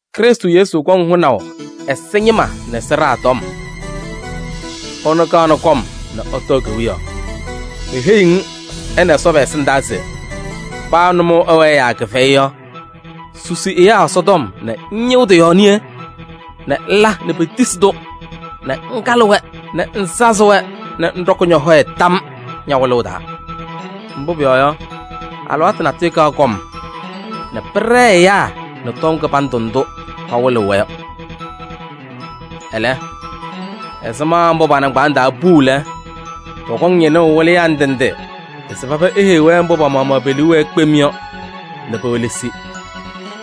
Krɩstʋ Yesu kɔŋ hʋnaʋ ɛza ñɩma nɛ sɩɖaa tɔm. Ɛnʋ kaɣnɩ kɔm nɛ ɛtɔɔ kewiyaɣ. Meheyiɣ-ŋ ɛ nɛ Ɛsɔ pɛ-ɛsɩndaa se: paa nʋmɔʋ ɛwɛɛ yaa kɩfɛyɩ yɔ, susi ɛyaa Ɛsɔtɔm nɛ ŋñɩɣ tɩ-yɔɔ niye nɛ ŋla nɛ petisi-tʋ nɛ ŋkalɩ-wɛ nɛ ŋsazɩ-wɛ nɛ ŋɖɔkɩ ñɔ-hɔyɛ tam ña-wɩlʋʋ taa. Mbʋ pʋyɔɔ yɔ, alɩwaatʋ natʋyʋ kaɣ kɔm nɛ pɩɖɛɛ ɛyaa nɛ tɔm kɩbandʋ ndʋ pawɩlɩɣ-wɛ yɔ. Ɛlɛ, ɛzɩma mbʋ pa-nɩŋgbaaŋ taa puu lɛ, pɔkɔŋ ñɩnʋʋ wɩlɩyaa ndɩ ndɩ se paba eheyi-wɛ mbʋ pa-maɣmaɣ pe-liu wɛɛ kpem yɔ nɛ pewelesi.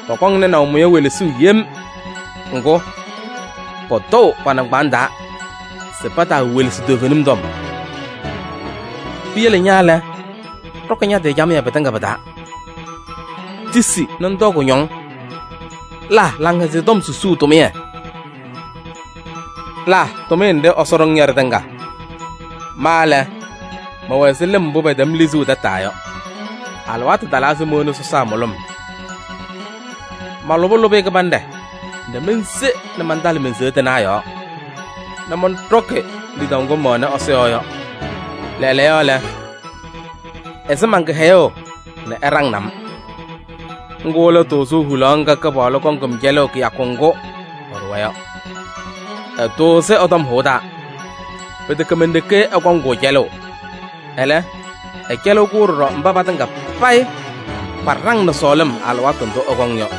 Pɔkɔŋ nɩnaʋ mʋya welesuu yem. Ŋgʋ, pɔtɔʋ pa-nɩŋgbaaŋ taa se pataawelesi toovenim tɔm. Piyele ña lɛ, ɖɔkɩ ña-tɩ camɩyɛ pɩtɩŋa pɩ-taa. Tisi nɛ ŋtɔɔ kʋñɔŋ, la Laŋhɛzɩyɛ Tɔm susuu tʋmɩyɛ, la tʋmɩyɛ nɖɩ Ɛsɔ ɖʋ-ŋ yɔ ɖɩtɩŋa. Ma lɛ, mɛwɛ ɛzɩ lɩm mbʋ pɛtɛm lizuu tataa yɔ, alɩwaatʋ talaa se mowoni sɔsaa mʋlʋm. Malʋbɩ lʋbɩyɛ kɩbanɖɛ nɛ mense nɛ mantalɩ men-seya tɩnaɣ yɔɔ nɛ mɔnɖɔkɩ lidaʋ ŋgʋ mɛwɛnɩ Ɛsɔ yɔɔ yɔ. Lɛɛlɛɛyɔ lɛ, ɛsɩ man-kɩhɛyʋʋ nɛ ɛɖaŋnɩ-m: ŋgʋ lɛ tʋʋzʋʋ hulaɣ ŋga Kɩpaɣlʋ kɔŋ-m cɛlʋʋ kɩyakʋ ŋgʋ ɛɖʋwa yɔ. Ɛtʋʋzɩ ɛ-tɔm hʋʋ taa. Pɩtɛkɛ men-ɖeke ɛkɔŋ-kʋ cɛlʋʋ, ɛlɛ, ɛcɛlɩɣ-kʋ ɖɔɖɔ mba patɩŋa payɩ paɖaŋnɩ sɔɔlɩm alɩwaatʋ ndʋ ɛkɔŋ yɔ.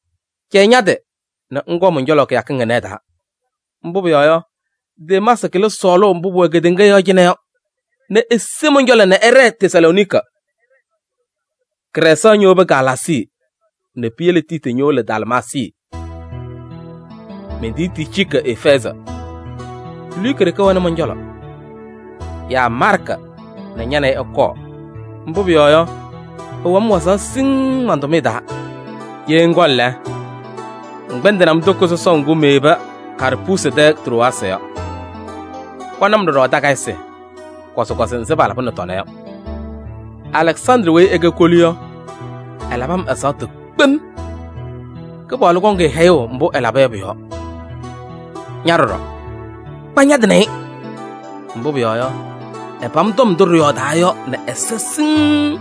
Cɛyɩ ña-tɩ nɛ ŋkɔɔ mɔn-cɔlɔ kɩyakɩŋ ɩnɛ ɩ-taa. Mbʋ pʋyɔɔ yɔ, Demaasɩ kɩlɩ sɔɔlʋʋ mbʋ pʋwɛ kedeŋa yɔɔ cɩnɛ yɔ nɛ ese mɔn-cɔlɔ nɛ ɛɖɛɛ Tesalooniki. Krɛɛsaɣ ñowobi Galaasii nɛ piyele Tiiti ñowolo Dalmaasii. Mentiyi Ticiiki Efɛɛzɩ. Luka ɖeke wɛnɩ mɔn-cɔlɔ. Yaa Maarkɩ nɛ ña nɛ ɩ ɩkɔɔ, mbʋ pʋyɔɔ yɔ, ɛwɛɣ-m wazaɣ siŋŋ man-tʋmɩyɛ taa. Ye ŋkɔŋ lɛ, ŋkpɛndɩnɩ-m toko sɔsɔʋ ŋgʋ meyebi Karpuusi tɛ Trowaasɩ yɔ. Kɔnɩ-m ɖɔɖɔ takayɩsɩ, kɔzɩkɔzɩ nzɩ palabɩnɩ tɔna yɔ. Alɛksandrɩ weyi ɛkɛ kolu yɔ, ɛlabɩ-m ɛzaɣtʋ kpem. Kɩpaɣlʋ kɔŋ-ɩ hɛyʋʋ mbʋ ɛlaba yɔ pʋ-yɔɔ. Ña ɖɔɖɔ, kpa ña-tɩ nɛ ɩ, mbʋ pʋyɔɔ yɔ, ɛpam tɔm ndʋ ɖɩyɔɔdaa yɔ nɛ ɛza siŋŋ.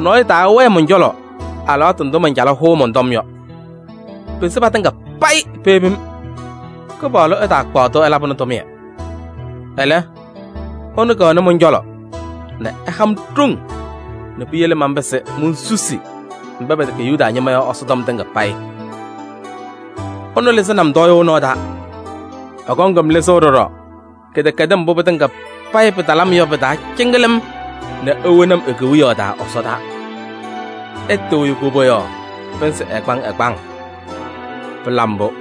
Nɔɔyʋ taawɛɛ mɔn-cɔlɔ alɩwaatʋ ndʋ mancalɩ hʋʋ mɔn-tɔm yɔ, pese patɩŋa payɩ peyebi-m. Kɩpaɣlʋ ɛtaakpaɣ-tʋ ɛlabɩnɩ tʋmɩyɛ. Ɛlɛ, ɛnʋ kɛwɛnɩ mɔn-cɔlɔ nɛ ɛha-m ɖoŋ nɛ piyele manpɩzɩ monsusi mba pɛtɛkɛ Yuda ñɩma yɔ Ɛsɔtɔm tɩŋa payɩ. Ɛnʋ lɩzɩnɩ-m tɔɔyʋʋ nɔɔ taa. Ɛkɔŋ-m lɩzʋʋ ɖɔɖɔ kɩdɛkɛdɩm mbʋ pɩtɩŋa payɩ pɩtalɩ-m yɔ pɩ-taa cɩŋɩlɩm nɛ ewoni-m e-Kewiyaɣ taa ɛsɔdaa. Ɛtɩɣyɩ koboyaɣ pɩnzɩ ɛgbaŋ ɛgbaŋ! Pɩla mbʋ!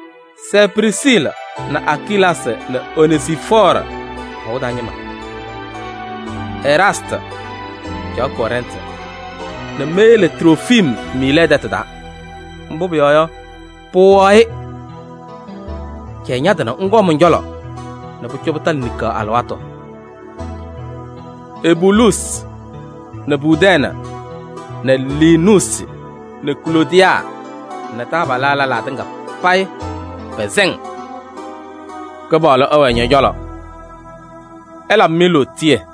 Sɛɛ Prisiili nɛ Akilaasɩ nɛ Onezifɔɔrɩ hɔʋ taa ñɩma. Eraastɩ caɣ Kɔrɛntɩ nɛ meyele Trofim Miilɛɛ tɛtʋ taa, mbʋ pʋyɔɔ yɔ, pɩwɩɣaɣ-ɩ. Cɛyɩ ña-tɩ nɛ ŋkɔɔ mɔn-cɔlɔ nɛ pʋcɔ pɩtalɩ niŋkaɣ alɩwaatʋ. Ebuluusi nɛ Pudɛɛnɩ nɛ Liinuusi nɛ Kloodiyaa nɛ taabalaa lɛlaa tɩŋa pɛsɛ-ŋ. Kɩpaɣlʋ ɛwɛɛ ñɔ-cɔlɔ. Ɛlabɩ-mɩ lootiye.